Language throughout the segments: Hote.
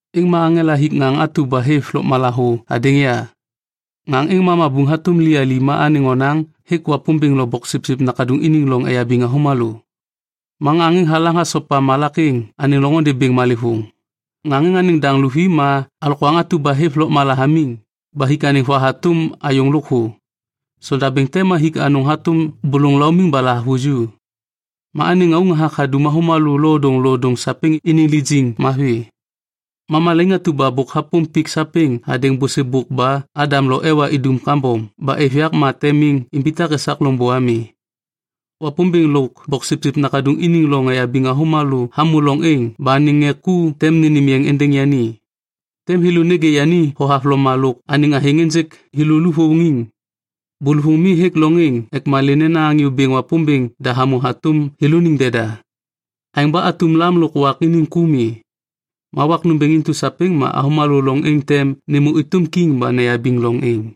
Êŋ ma aŋela hik ŋaŋ atu ba hêv lôkmala thô hadêŋ ya. Ŋaŋ êŋ ma mabuŋ hatôm liyali ma anêŋ onaŋ hêk Wapômbêŋ lo Boksipsip Nakaduŋ iniŋ loŋ eyabiŋ avômalô. Ma ŋaŋ êŋ halaŋ hasopa malak êŋ anêŋ loŋôndê bêŋ malêvôŋ. Ŋaŋ êŋ anêŋ daŋ luvi ma alokwaŋ atu ba hêv lôkmala hamiŋ ba hik anêŋ va hatôm ayôŋ lôkthô. Sondabêŋ te ma hik anôŋ hatôm bôlôŋ laumiŋ ba lahavuju. Ma anêŋ ŋauŋ hathak hadum avômalô lodôŋlodôŋ sapêŋ iniŋ lijiŋ mavi. Ma malaiŋ atu ba bôk hapôm pik sapêŋ hadêŋ bôsêbôk ba Adam lo Ewa idum kambom ba êv yak ma tem miŋ imbitak esak loŋbô ami. Wapômbêŋ lôk Boksipsip Nakaduŋ iniŋ loŋ eyabiŋ avômalô hamô loŋ êŋ ba anêŋ ŋê ku tem nênêm yeŋ êndêŋ yani. Tem thêlô nêgê yani thohavloma lôk anêŋ athêŋ ênjêk thêlô luvôŋiŋ. Bôlôvôŋ mi hêk loŋ êŋ ek malê nena Anyô Bêŋ Wapômbêŋ da hamô hatôm thêlôniŋ deda. Aêŋ ba atum lam lôk wak iniŋ ku mi. Ma wak nômbêŋ intu sapêŋ ma avômalô loŋ êŋ tem nêmô êtôm kiŋ ba neyabiŋ loŋ êŋ.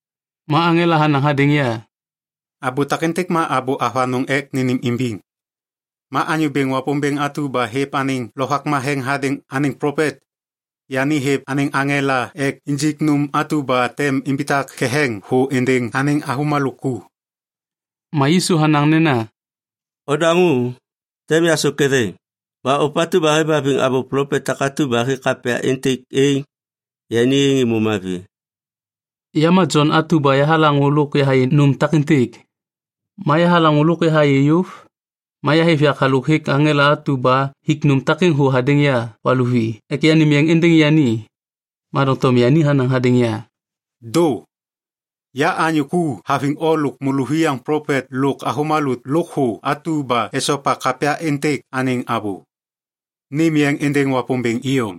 Ma aŋela hanaŋ hadêŋ ya, “Abô takêntêk ma abô avanôŋ ek nênêmimbiŋ. Ma Anyô Bêŋ Wapômbêŋ atu ba hêv anêŋ Lovak Matheŋ hadêŋ anêŋ plopet, yani hêv anêŋ aŋela ek injik nôm atu ba tem imbitak ketheŋ thô êndêŋ anêŋ avômalô ku.” Ma Yisu hanaŋ nena, “Odaŋô! Tem yasôk ketheŋ. Ba ôpatu ba hêvhaviŋ abô plopet takatu ba hêk kapya êntêk êŋ, yani êŋ êmô mavi.” Ya ma Jon atu ba yahalaŋô lôk yahayê nôm takêntêk. Ma yahalaŋô lôk yahayê yôv, ma yahêv yak halôk hêk aŋela atu ba hik nôm takêŋ thô hadêŋ ya valuvi ek yanêm yeŋ êndêŋ yani. Ma doŋtom yani hanaŋ hadêŋ ya, “Dô! Ya anyô ku haviŋ o lôk môlôviyaŋ plopet lôk avômalô lôkthô atu ba esopa kapya êntêk anêŋ abô. Nêm yeŋ êndêŋ Wapômbêŋ iyom.”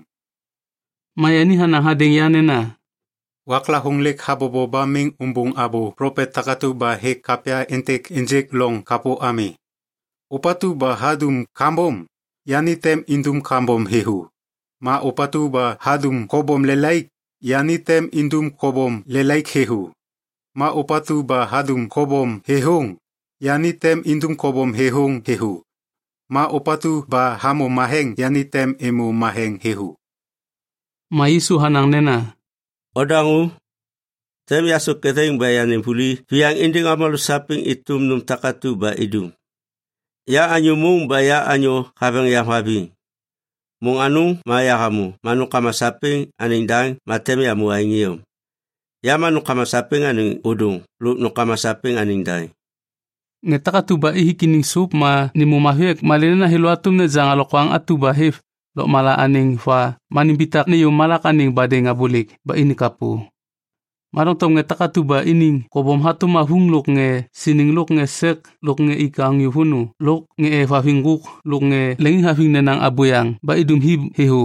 Ma yani hanaŋ hadêŋ ya nena, “Waklavôŋ lêk habobo ba miŋ umbuŋ abô plopet takatu ba hêk kapya êntêk ênjêk loŋ kapô ami. Ôpatu ba hadum kambom, yani tem indum kambom thêthô. Ma ôpatu ba hadum kobom lelaik, yani tem indum kobom lelaik thêthô. Ma ôpatu ba hadum kobom thêthôŋ, yani tem indum kobom thêthôŋ thêthô. Ma ôpatu ba hamô matheŋ, yani tem êmô matheŋ thêthô.” Ma Yisu hanaŋ nena, “Odaŋô! Tem yasôk ketheŋ ba yanêm vuli viyaŋ êndêŋ avômalô sapêŋ êtôm nôm takatu ba idum. Ya anyô môŋ ba anyô haveŋ yam haviŋ. Môŋ anôŋ ma yahamô ma nômkama sapêŋ anêŋ daŋ ma tem yamô aêŋ iyom. Ya ma nômkama sapêŋ anêŋ ôdôŋ lôk nômkama sapêŋ anêŋ daŋ. Ŋê takatu ba ithik iniŋ sôp ma nêmô mavi ek malê nena thêlô hatôm nejaŋ alokwaŋ atu ba hêv lôkmala anêŋ va ma nimbitak nêyô malak anêŋ badêŋ abôlêk ba ini kapô. Ma doŋtom ŋê takatu ba iniŋ kobom hatôm avuŋ lôk ŋê siniŋ lôk ŋê sek lôk ŋê ik anyô vônô lôk ŋê êvhaviŋ ŋgôk lôk ŋê leŋiŋhaviŋ nenaŋ abôyaŋ ba idum hi thêthô,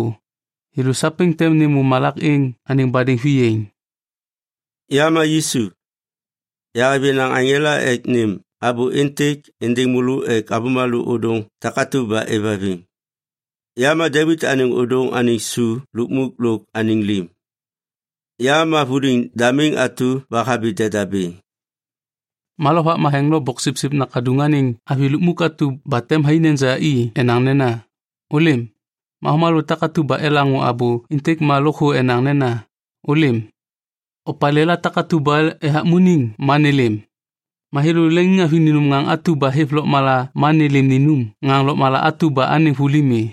thêlô sapêŋ tem nêmô malak êŋ anêŋ badêŋ viyaiŋ. “Ya ma Yisu. Yahêv yenaŋ aŋela ek nêm abô êntêk êndêŋ môlô ek avômalô ôdôŋ takatu ba êvhaviŋ. Ya ma Devit anêŋ ôdôŋ anêŋ su lukmuk lôk anêŋ lim. Ya ma vuliŋ damiŋ atu ba habi deda bêŋ.” Ma Lovak Matheŋ lôk Boksipsip Nakaduŋ anêŋ avi lukmuk atu ba tem thai neja i enaŋ nena, “Ôlêm.” Ma avômalô takatu ba elaŋô abô êntêk ma lôkthô enaŋ nena, “Ôlêm.” Opalêla takatu ba ethakmuniŋ ma nêlêm. Ma thêlô leŋiŋhaviŋ ninum ŋaŋ atu ba hêv lôkmala ma nêlêm ninum ŋaŋ lôkmala atu ba anêŋ vuli mi.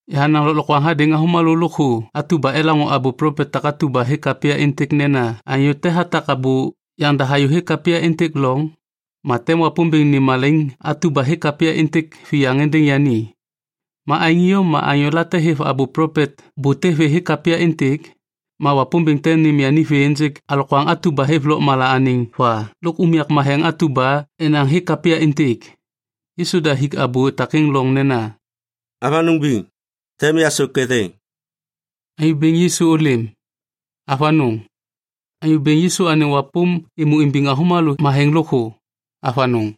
Yahanaŋ lôklokwaŋ hadêŋ avômalô lôkthô atu ba elaŋô abô plopet takatu ba hêk kapya êntêk nena anyô te hatak abô yaŋda hayôhêk kapya êntêk loŋ, ma tem Wapômbêŋ nêm malaiŋ atu ba hêk kapya êntêk viyaŋ êndêŋ yani. Ma aêŋ iyom ma anyôla hêv abô plopet bute vê hêk kapya êntêk, ma Wapômbêŋ tem nêm yani vê ênjêk alokwaŋ atu ba hêv lôkmala anêŋ va lôk unyak matheŋ atu ba enaŋ hêk kapya êntêk. Yisu da hik abô takêŋ loŋ nena, “Avanôŋ biŋ, tem yasôk ketheŋ.” Anyô Bêŋ Yisu ôlêm! Avanôŋ. Anyô Bêŋ Yisu anêŋ wapôm êmô imbiŋ avômalô matheŋ lôkthô. Avanôŋ.